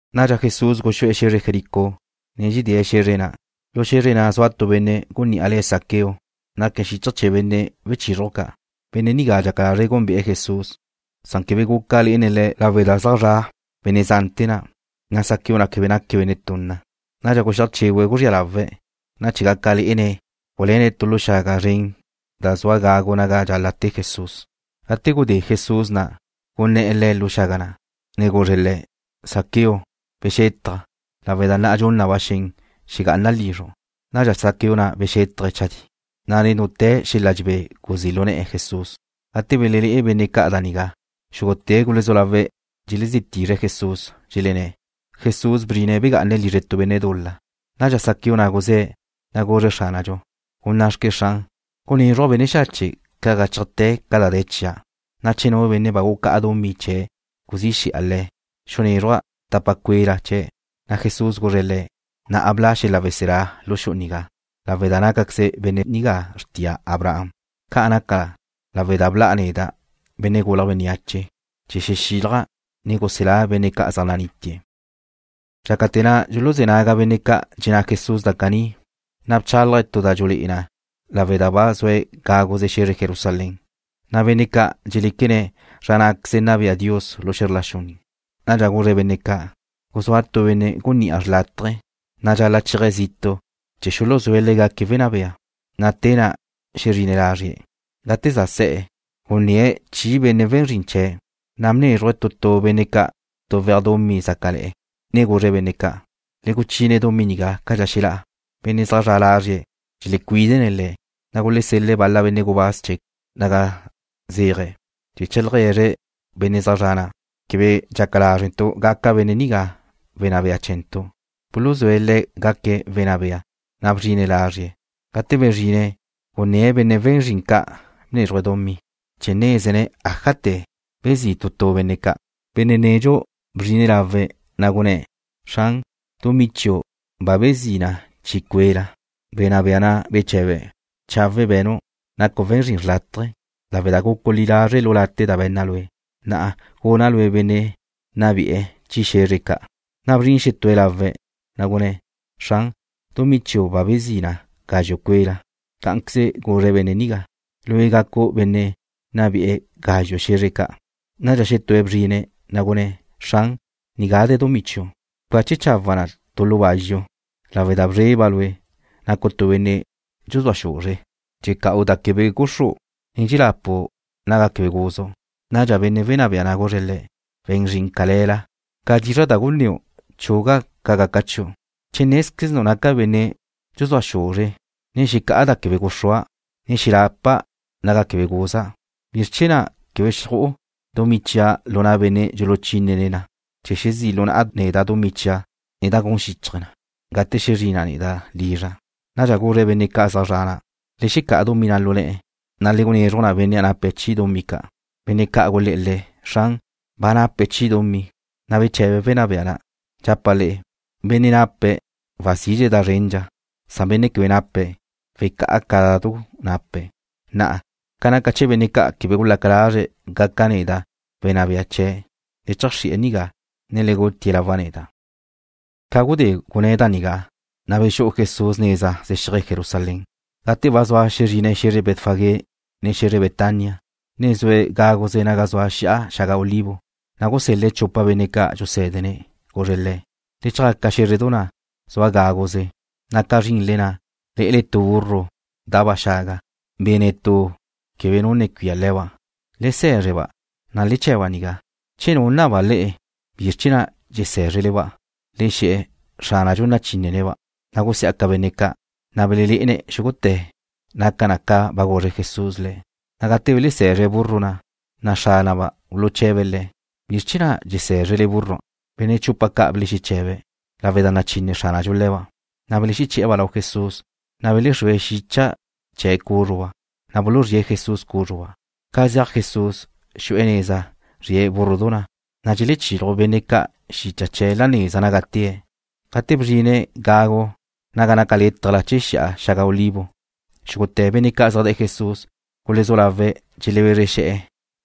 Nadxa Jesús guxú'e̱ xe̱zre Jericó, ne dxedée̱' xe̱zre na'. Lu xe̱zre na' zua tu benne' gunní'a le̱' Zaqueo. Naque̱' xíchaje̱ chee̱ benne' wechizruj ca'. Benne' nigá dxaca lazre̱' gúnbe'e̱ Jesús, san quebe guca lé'ene̱' Le̱' lawe' da zaj zra' benne' zante̱ na', na' Zaqueo na' quebe naque̱' benne' tunna. Nadxa guxíaj chégüe̱' guzría lawe̱', ne chee̱ gaca lé'ene̱' guluéne̱' tu lu xaga zren da zua gagu naga dxal-la' te Jesús. Gate gudé Jesús na', gunné̱'e̱ lu xaga na', ne guzre̱' le̱': ―Zaqueo, bexétajche, lawe' da na'a dxun na ba xen xegá'ana' lizru'. Nadxa Zaqueo na' bexétaje̱' chadí, na' nen dute̱ xel-la dxebé guzí' lu ne̱'e̱ Jesús. Gate belelé'e benne' ca' da nigá, xúgute̱' gulezú lawe̱' dxelezí tizre̱' Jesús, dxelenné̱': ―Jesús bzrine̱' begá'ane̱' lizre tu benne' dul-la. Nadxa Zaqueo na' guzé̱', na' guzre̱' Xránadxu: ―Gunná'xque, Xran, gunézruja' benne' xache' ca' gáchajte̱ ca da de̱ chia', na' che nu benne' bsaca zia' le̱', xunézruja' tapa cue'la chee̱'. Na' Jesús guzre̱' le̱': ―Na'a bla' xel-la weselá lu xu'u nigá, lawe' da nácaqueze benne' nigá xrtia Abraham. Ca' naca na lawe' da bla' neda', Benne' Gulje̱' Bénneache, chee̱ xexílaja', ne guselá' benne' ca' zaj nanítie̱'. Dxácate̱ na' dxuluzé̱ naga benne' ca' dxenná Jesús da caní, na' bchálaje̱' tu da dxulé'e na lawe' da ba zue̱' gáguze xe̱zre Jerusalén, na' benne' ca' dxeléquene̱' zra ná'queze nna bea Dios lu xe̱zr la xu nigá. Nadxa guzre̱' benne' ca': ―Guzúa tu benne' gunní'a xrlátaje, na' dxal-la' chéaje̱' zitu' chee̱ xuluzúe̱' le̱' gaque̱' wenná bea, na' te na' xezrine̱' lazrie̱'. Gate za se̱'e̱, gunné̱' chi benne' we̱n zrin chee̱', na' bnézruje̱' tu tu benne' ca' tuwéaj dumí zácale̱'e̱, ne guzre̱' benne' ca': “Le guchine dumí nigá cadxa xelá'a.” Benne' zaj zre̱'e̱ lázrie̱' dxelecuídene̱' le̱', na' gulesel-le̱' bal-la benne' gubáz chee̱' naga zéaje̱' chee̱ cheajlegue̱zre̱' benne' zaj zre̱'e̱ na': “Quebe dxaca lázrentu' gaca benne' nigá wenná bea chee̱ntu'.” Buluzúe̱' le̱' gaque̱' wenná bea, na' bezrine̱' lázrie̱'. Gate bezrine̱' gunné̱' benne' we̱n zrin ca' bnézruje̱' dumí, chee̱ nézene̱' ájate̱ bezí' tu tu benne' ca'. Benne' nedxu bzrine̱' lawe̱', na' gunné̱': “Xran, dumí chiu' ba bezí na chi cue'la.” Wenná bea na' beche̱be̱': “Chawe' be̱nu'. Nacu' we̱n zrin xrlátaje. Lawe' da gucu' li lazre' lu late' da be̱nna' lue', na'a guna' lue' benne' nna be'ene̱' chi xe̱zre ca'.” Na' bzrin xetúe̱' lawe̱', na' gunné̱': “Xran, dumí chiu' ba bezí na gazxu' cue'la.” Cá'anqueze guzre̱' benne' nigá: “Lue' gacu' benne' nna be'ene̱' gazxu' xe̱zre ca'.” Nadxa xetúe̱' bzrine̱', na' gunné̱': “Xran, nigá de̱ dumí chiu'. Bcache chawa'a na tu lu bazxu, lawe' da bzreba' lue'. Nacu' tu benne' dxuzúa xuzre. Dxexeca'u da quebe guxru', ne dxexelapu' naga quebe guzu'.” Nadxa wenná bea na' guzre̱' le̱': “We̱n zrin cale̱la. Ca dizra' da gunnéu' chuga' ca gaca chiu'. Che nézquezenu' naca' benne' dxuzúa xuzre, ne xecá'a da quebe guxrúa', ne dxelapa' naga quebe guza', ¿bizr chee̱ na' quebe xju'u dumí chia' lu na' benne' xuluchínene̱' na, chee̱ xezí' lu na'a neda' dumí chia' nen da gun xíchaje̱ na, gate xezrina' neda' lizra'?” Nadxa guzre̱' benne' ca' zaj zre̱'e̱ na': “Le xecá'a dumí na' lu ne̱'e̱, na' le gunezruj na benne' nape̱' chi dumí ca'.” Benne' ca' gulé̱'e̱ le̱': “Xran, ba nape̱' chi dumí.” Na' beche̱be̱' wenná bea na': “Dxapa' le'e, benne' nape̱' wazidxe̱' da zrendxa, na benne' quebe nape̱', wecá'a ca da du nape̱'. Na'a, ca naca chee̱ benne' ca' quebe gulaca lazre̱' gaca' neda' wenná bea chee̱', le cheajxri'e̱ nigá, ne le gutie̱' lawa' neda'.” Ca gudé gunné̱' da nigá, na' bexú'u Jesús neza zexíaje̱' Jerusalén. Gate ba zua xezrine̱' xe̱zre Betfagé, ne xe̱zre Betania, ne zue̱' gáguze naga zua Xi'a Xaga Olivo, na' gusel-le̱' chupa benne' ca' dxusé̱dene̱'. Guzre̱' le̱': ―Le chjaca xé̱zredu na' zua gáguze, na' ca zrinle na' lé'ele tu burru da'ba' xaga, be̱ netú quebe nu ne cuía le̱ba'. Le se̱zre-ba', na' le che̱'-ba' nigá. Che nu naba le'e bizr chee̱ na' dxesé̱zrele-ba', le xe̱'e̱ Xránadxu nachínene̱'-ba'. Na' gusiá'ca benne' ca', na' belelé'ene̱' xúgute̱ naca na ca ba guzre Jesús le̱'. Na' gate dxelese̱zre̱' búrrua', na' xránaba' buluche̱be̱' le̱': ―¿Bizr chee̱ na' dxesé̱zrele búrrua'? Benne' chupa ca' belexeche̱be̱': ―Lawe' da nachine Xránadxu le̱ba'. Na' beleché̱'e̱-ba' lau Jesús, na' belexrúe̱' xicha chee̱' cúzruba', na' buluzríe̱' Jesús cúzruba'. Ca zeaj Jesús, xu'e̱ neza zrie̱' búrrudu na', na' dxelechiluj benne' ca' xicha chee̱' la neza naga tée̱'. Gate bzrine̱' gagu naga naca létajla chee̱ Xi'a Xaga Olivo, xúgute̱ benne' ca' zaj de̱'e̱ Le̱' gulezú lawe̱' dxelebezre xe̱'e̱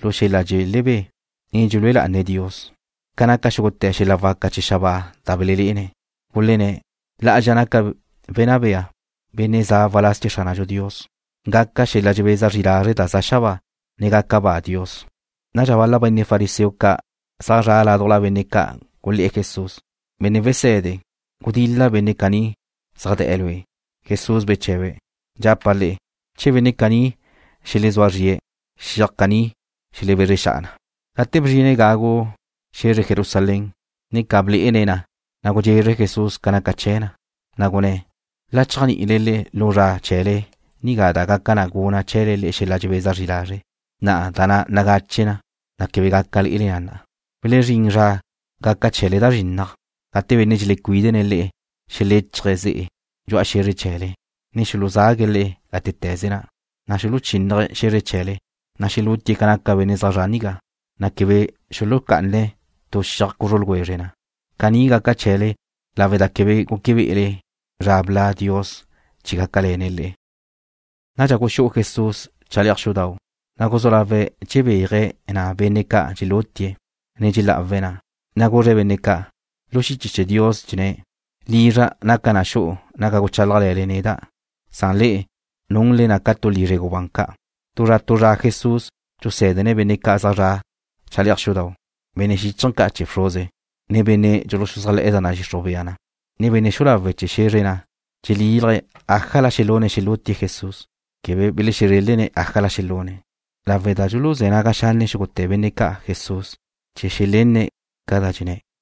lu xel-la dxelebé, ne dxelúe lá'ane̱' Dios ca naca xúgute̱ xel-la waca chee̱ xabáa da belelé'ene̱'. Gulenné̱': ―La'azxa naca wenná bea, benne' za' waláz chee̱ Xránadxu Dios. Gaca xel-la dxebeza zri lazre' da za xabáa, ne gaca ba Dios. Nadxa bal-la benne' fariseo ca' zaj zra' ládujla benne' ca' gulé̱'e̱ Jesús: ―Benne' Wese̱de, gudil-la benne' caní zaj de̱'e̱ Lue'. Jesús beche̱be̱': ―Dxapa' le'e, che benne' caní xelezúa zrie̱', xiaj caní xelebezre xa'a na. Gate bzrine̱' gagu xe̱zre Jerusalén, ne ca blé'ene̱' na, na' gudxezre Jesús ca naca chee̱ na. Na' gunné̱': ―La chéajni'ile lu zra chee̱le nigá da gaca gunna chee̱le xel-la dxebeza zri lazre'. Na'a da na' nagache na, na' quebe gaca lé'ele na. Welezrín zra gaca chee̱le da zrinnaj, gate benne' dxelecuídene̱' le'e xeléchaje̱' ze'e dxu'a xe̱zre chee̱le, ne xuluzague̱' le'e gátete̱ze na', na' xuluchínnaje̱' xe̱zre chee̱le. Na' xelútie̱' ca naca benne' zaj zre̱'e̱ nigá, na' quebe xuluxucá'ane̱' tu xiaj cuzru ljwezre na. Caní gaca chee̱le lawe' da quebe gúquebe'ele zra bla' Dios chee̱ gácale̱ne̱' le'e. Nadxa guxú'u Jesús chale'aj xudau', na' guzú lawe̱' dxebéaje̱' na' benne' ca' dxelutie̱', ne dxelá'awe̱' na'. Na' guzre̱' benne' ca': ―Lu xiche chee̱ Dios dxenné̱': “Lizra' naca na xu'u naga guchálajle̱le neda',” na' le'e nunle na ca tu lizre gubán ca'. Tu zra tu zra Jesús dxusé̱dene̱' benne' ca' zaj zra' chale'aj xudau'. Benne' xíchaje̱ ca' chee̱ bxruze, ne benne' dxuluxuzájle̱'e̱ da nadxixruj bea na, ne benne' xu'u lawe' chee̱ xe̱zre na' dxelílaje̱' ájala xelune̱' xelútie̱' Le̱'. Quebe belezrélene̱' ájala xelune̱', lawe' da dxuluzé̱ naga xanne' xúgute̱ benne' ca' Jesús, chee̱ xelenne̱' ca da dxenné̱'.